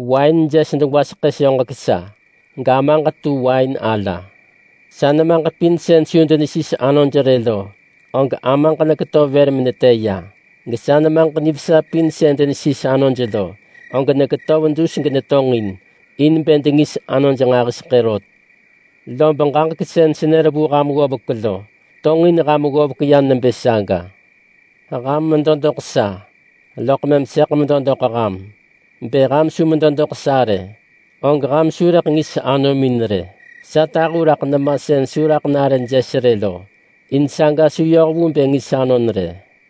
“Wain jes degwaseḳë soġek sa, gAmaġ tu wain ala. Sa nemaġ pin sën su denesis anoj rë lo, og Amaġ neketöv vër menetë ya, gesa nemaġ nivesa pin sën denesis anoj lo, og neketöv dus genetonġin, in bë dengis anoj nġahiseḳë rot. Lob ġaġek sën senër vu ham ggovek lo, tonġin ham ggovek ya nebë saga. Ham medo doḳ sa, loḳ mëm sëḳ medo doḳ ham. Bë ham su medo doḳ sa rë, og ham su rëḳ ngis anomin rë. Sa tahu raḳ nema sën su raḳ nare jes rë lo, in saga su yoh vu bë ngis anon rë.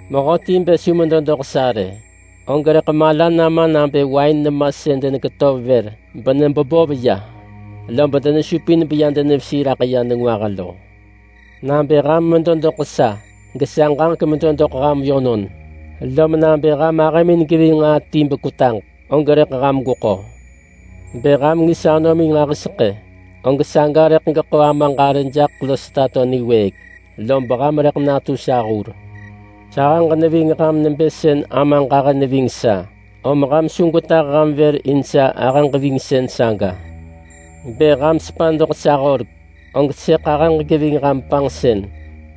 Mehöti bë su medo doḳ sa rë, og rëḳ mala nama nabë wain nema sën deneketöv vër benebebov ya lob denesupin beya denevesi raḳ ya nengwah lo. Nabë ham medo doḳ sa gesa ġaġek medo doḳ ham yönon, lom nabë ham ahëmin geving nġaa ti bekwetaġ, og rëḳ ham gweko. Bë ham ngis anomin nġahiseḳë, og saga rëḳ geḳo Amaġ arë jaḳ los tato niwëëk, lob ham rëḳ natu sa hur. Sahëġ neving ham nebë sën Amaġ ahë neving sa, om ham su gwetah ham vër in sa ahëġ-vingsën saga. Bë ham sepa doḳ sa horek, og sëḳ ahëġ geving ham panġsën,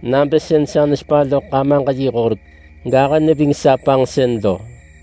nabë sën sa nesepa loḳ Amaġ yi horek, gahë neving sa panġsën lo.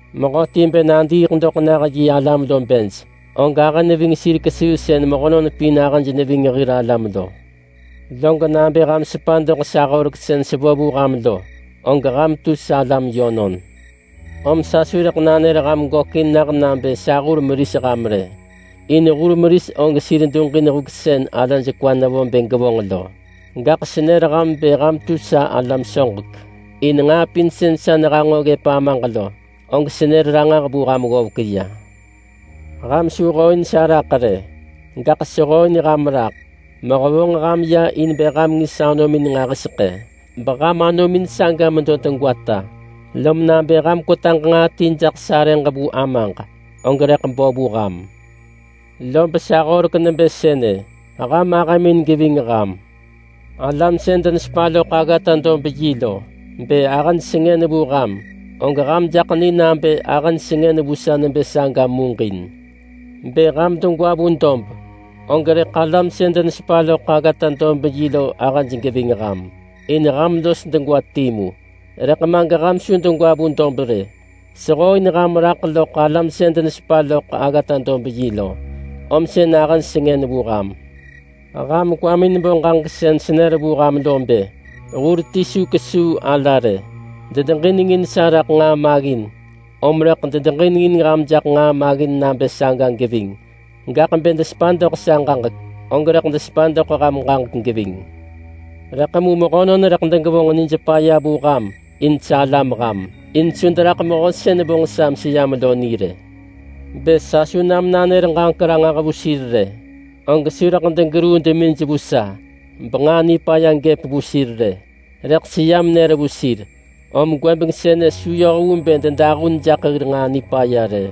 Mehöti bë nadiiḳ doḳ nah yi alam lo bej, og ahë neving sir kesuu sën mehönon pin ahëj neving hir alam lo. Log nabë ham sepa doḳ sa horek sën sevo vu ham lo, og ham tu salam yönon. Om sa su rëḳ nanër ham gökin nah nabë sa hur meris ham rë, in hur meris og sir duġin huk sën alaj kwa nevo bë gevonġ lo. Gaḳ senër ham bë ham tu sa alam soġek, in nġaa pin sën sa nehanġo ggëp Amaġ lo, og senër ranġah vu ham ggovek ya. Ham su hooin sa raḳ rë, gaḳ sehooin ham raḳ mehevonġ ham ya in bë ham ngis anomin nġahiseḳë beham anomin saga medo degwata. Lom nabë ham kwetaġ nġaa ti jaḳ sarëġ vu Amaġ, og rëḳ bo vu ham. Lob sa horek nebë sënë: Ham ahëmin geving ham!” “Alam sën denesepa loḳ aggata-dob-yi lo, bë ahëj sengën vu ham, og ham jaḳ ni nabë ahëj sengën vu sa nebë saga muġin. Bë ham degwa vu dob, og rëḳ alam sën denesepa loḳ aggata-dob-yi lo ahëj geving ham, in ham los degwa timu. Rëḳ ma geham su degwa vu dob rë. Sehooin ham raḳ loḳ alam sën denesepa loḳ aggata-dob-yi lo, om sën ahëj sengën vu ham. Ham kwamin bo ġaġek sën senër vu ham lo bë: Hur ti su kesuu ala rë. Dedeġinengin sa raḳ nġaa maggin, om rëḳ dedeġinengin ham jaḳ nġaa maggin nabë saga geving. Gaḳ bë desepa doḳ sa ġaġek, og rëḳ desepa doḳ ham ġaġek geving. Rëḳ mu mehönon rëḳ degevonġ nij paya vu ham in salam ham, in su deraḳ Mehö sën vonġ sa meseyam lo ni rë. Bë sa su nam nanër ġaġek ranġah vu sir rë, og su rëḳ degeruu demij vu sa benġaa nipaya gëp vu sir rë. Rëḳ seyam nër vu sir, om gwëbeng sënë su yoh vu bë dedahun jaḳ hir nġaa nipaya rë.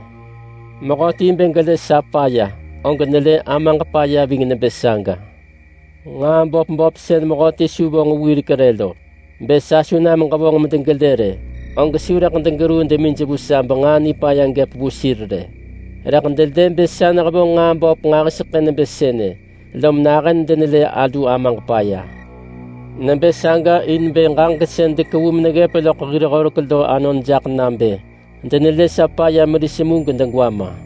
Mehöti bë gelë sa paya, og nelë Amaġ paya ving nebë saga. Nġaa böp böp sën mehöti su vonġ wirek rë lo, bë sa su nam ġevonġ medegelë rë, og su rëḳ degeruu demij vu sa benġaa nipaya gëp vu sir rë. Rëḳ delë bë sa nehevonġ nġaa böp nġahiseḳë nebë sënë, lom nahën denelë alu Amaġ paya. Nebë saga in bë ġaġek sën dekevu meneggëp loḳ hir horek lo anon jaḳ nabë: Denelë sa paya meris mu gedegwa ma.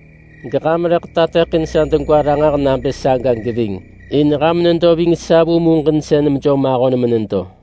Geham rëḳ tateḳin sa degwa ranġah nabë saga geving, in ham nedo ving sa vu muġinsën mejom ahon menedo.